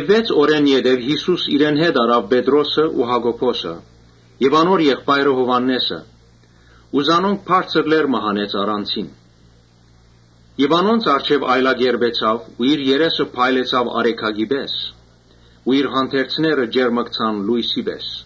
Վեց օր յետոյ Յիսուս իրեն հետ առաւ Պետրոսը ու Յակոբոսը եւ անոր եղբայրը Յովհաննէսը ու զանոնք բարձր լեռ մը հանեց առանձին։ Անոնց առջեւ այլակերպեցաւ ու իր երեսը փայլեցաւ արեգակի պէս ու իր հանդերձները ճերմկցան լոյսի պէս։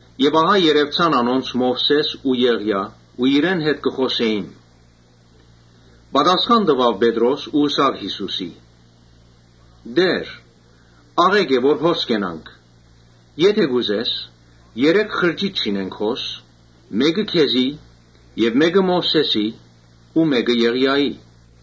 Եւ ահա երեւցան անոնց Մովսէսն ու Եղիան ու իրեն հետ կը խօսակցէին։ Խօսեցաւ Պետրոս ու ըսաւ Յիսուսի. «Տէ՛ր, աղէկ է որ հոս կենանք. եթէ կ’ուզես, երեք խրճիթ շինենք հոս, մէկը՝ քեզի, մէկը՝ Մովսէսին ու մէկը՝ Եղիային»։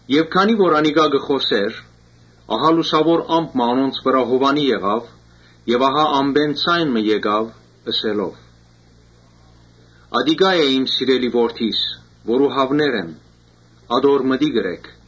Երբ անիկա կը խօսէր, լուսաւոր ամպ մը անոնց վրայ հովանի եղաւ եւ ամպէն ձայն մը եկաւ՝ ըսելով. «Ատիկա է սիրելի Որդիս, որուն հաւներ եմ, ատոր մտիկ ըրէք»։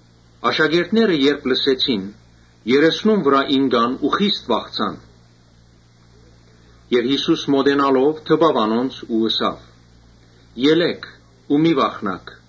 Աշակերտները երբ լսեցին, երեսնուն վրայ ինկան ու խիստ վախցան։ Յիսուս մօտենալով դպաւ անոնց ու ըսաւ. «Ելէ՛ք, մի՛ վախնաք»։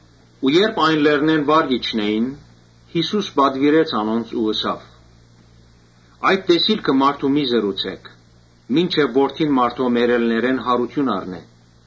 Երբ լեռնէն վար կ’իջնէին, Յիսուս պատուիրեց անոնց ու ըսաւ. «Այդ տեսիլքը մարդու մի՛ պատմէք, մինչեւ Որդին մարդոյ մեռելներէն յարութիւն առնէ»։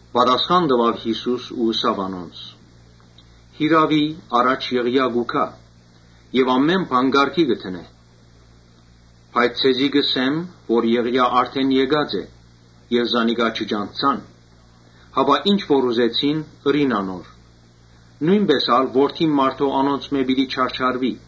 Պատասխան տուաւ Յիսուս ու ըսաւ անոնց. «Յիրաւի առաջ Եղիան կու գայ եւ ամէն բան կարգի կը դնէ։ Բայց ձեզի կ’ըսեմ թէ Եղիան արդէն եկած է եւ զանիկա չճանչցան, հապա ինչ որ ուզեցին ըրին անոր. նոյնպէս ալ Որդին մարդոյ անոնցմէ պիտի չարչարուի»։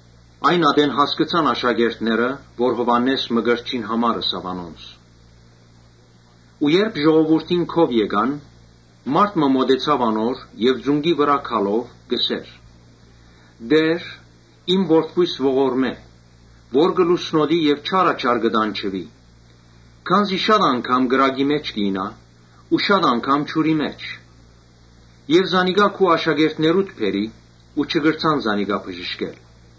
Այն ատեն հասկցան աշակերտները թէ Յովհաննէս Մկրտչին համար ըսաւ անոնց։ Երբ ժողովուրդին քով եկան, մարդ մը մօտեցաւ անոր եւ ծունկի վրայ գալով՝ ըսաւ. «Տէ՛ր, իմ որդիիս ողորմէ, որ կը լուսնոտի եւ չարաչար կը տանջուի, քանզի յաճախ կրակի մէջ կ’իյնայ ու յաճախ ջուրի մէջ։ Քու աշակերտներուդ բերի ու չկրցան զանիկա բժշկել»։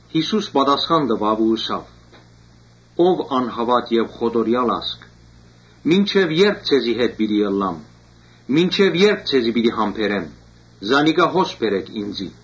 Յիսուս ըսաւ. «Ով անհաւատ եւ խոտորեալ ա՛զգ, մինչեւ ե՞րբ ձեզի հետ պիտի ըլլամ, մինչեւ ե՞րբ ձեզի պիտի համբերեմ. զանիկա հոս ինծի բերէք»։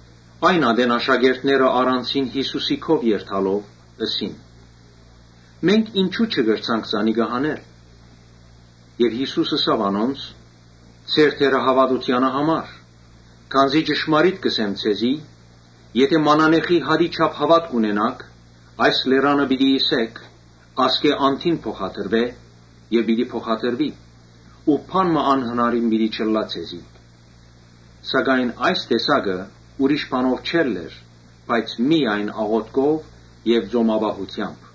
Այն ատեն աշակերտները առանձին Յիսուսի քով երթալով՝ ըսին. «Մենք ինչո՞ւ չկրցանք հանել»։ Յիսուս ըսաւ. «Ձեր թերահաւատութեանը համար. քանզի ճշմարիտ կ’ըսեմ ձեզի, Եթէ մանանեխի հատի չափ հաւատք ունենաք, այս լերան ըսէք, ‘Ասկէ անդին փոխադրուէ’, պիտի փոխադրուի ու բան մը անհնարին պիտի չըլլայ ձեզի։ Սակայն այս տեսակը ուրիշ բանով չելլեր, բայց միայն աղօթքով ու ծոմապահութեամբ»։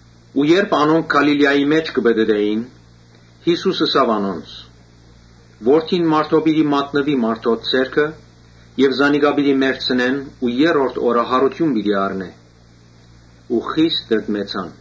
Երբ անոնք Գալիլիայի մէջ կը պտըտէին, Յիսուս ըսաւ անոնց. «Որդին մարդոյ պիտի մատնուի մարդոց ձեռքը Եւ զանիկա պիտի մեռցնեն, բայց երրորդ օրը յարութիւն պիտի առնէ»։ Անոնք խիստ տրտմեցան։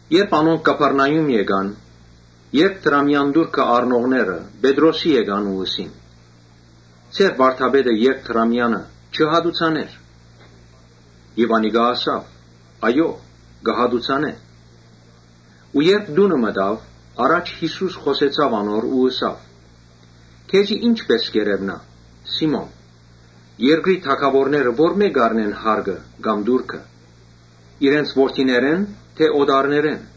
Երբ անոնք Կափառնայում եկան, երկդրամեան տուրքը առնողները Պետրոսին եկան ու ըսին. «Ձեր վարդապետը երկդրամեանը չի՞ հատուցաներ»։ Անիկա ըսաւ. «Այո՛, կը հատուցանէ»։ Երբ տունը մտաւ, առաջ Յիսուս խօսեցաւ անոր ու ըսաւ. «Քեզի ի՞նչպէս կ’երեւնայ, Սի՛մոն, երկրի թագաւորները որմէ՞ կ’առնեն հարկը կամ տուրքը. իրենց որդիներէ՞ն թէ օտարներէն»։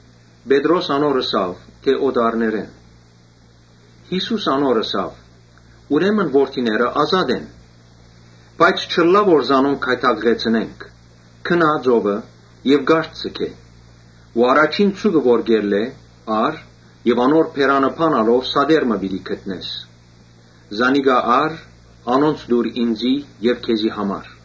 Պետրոս ըսաւ. «Օտարներէն»։ Յիսուս անոր ըսաւ. «Ուրեմն որդիները ազատ են, Բայց չըլլայ թէ զանոնք գայթակղեցնենք, գնա՛ ծովը եւ կարթը ձգէ ու առաջին ձուկը որ կ’ելլէ՝ ա՛ռ եւ անոր բերանը բանալով սատեր մը պիտի գտնես։ Անոնց տուր ինծի եւ քեզի համար»։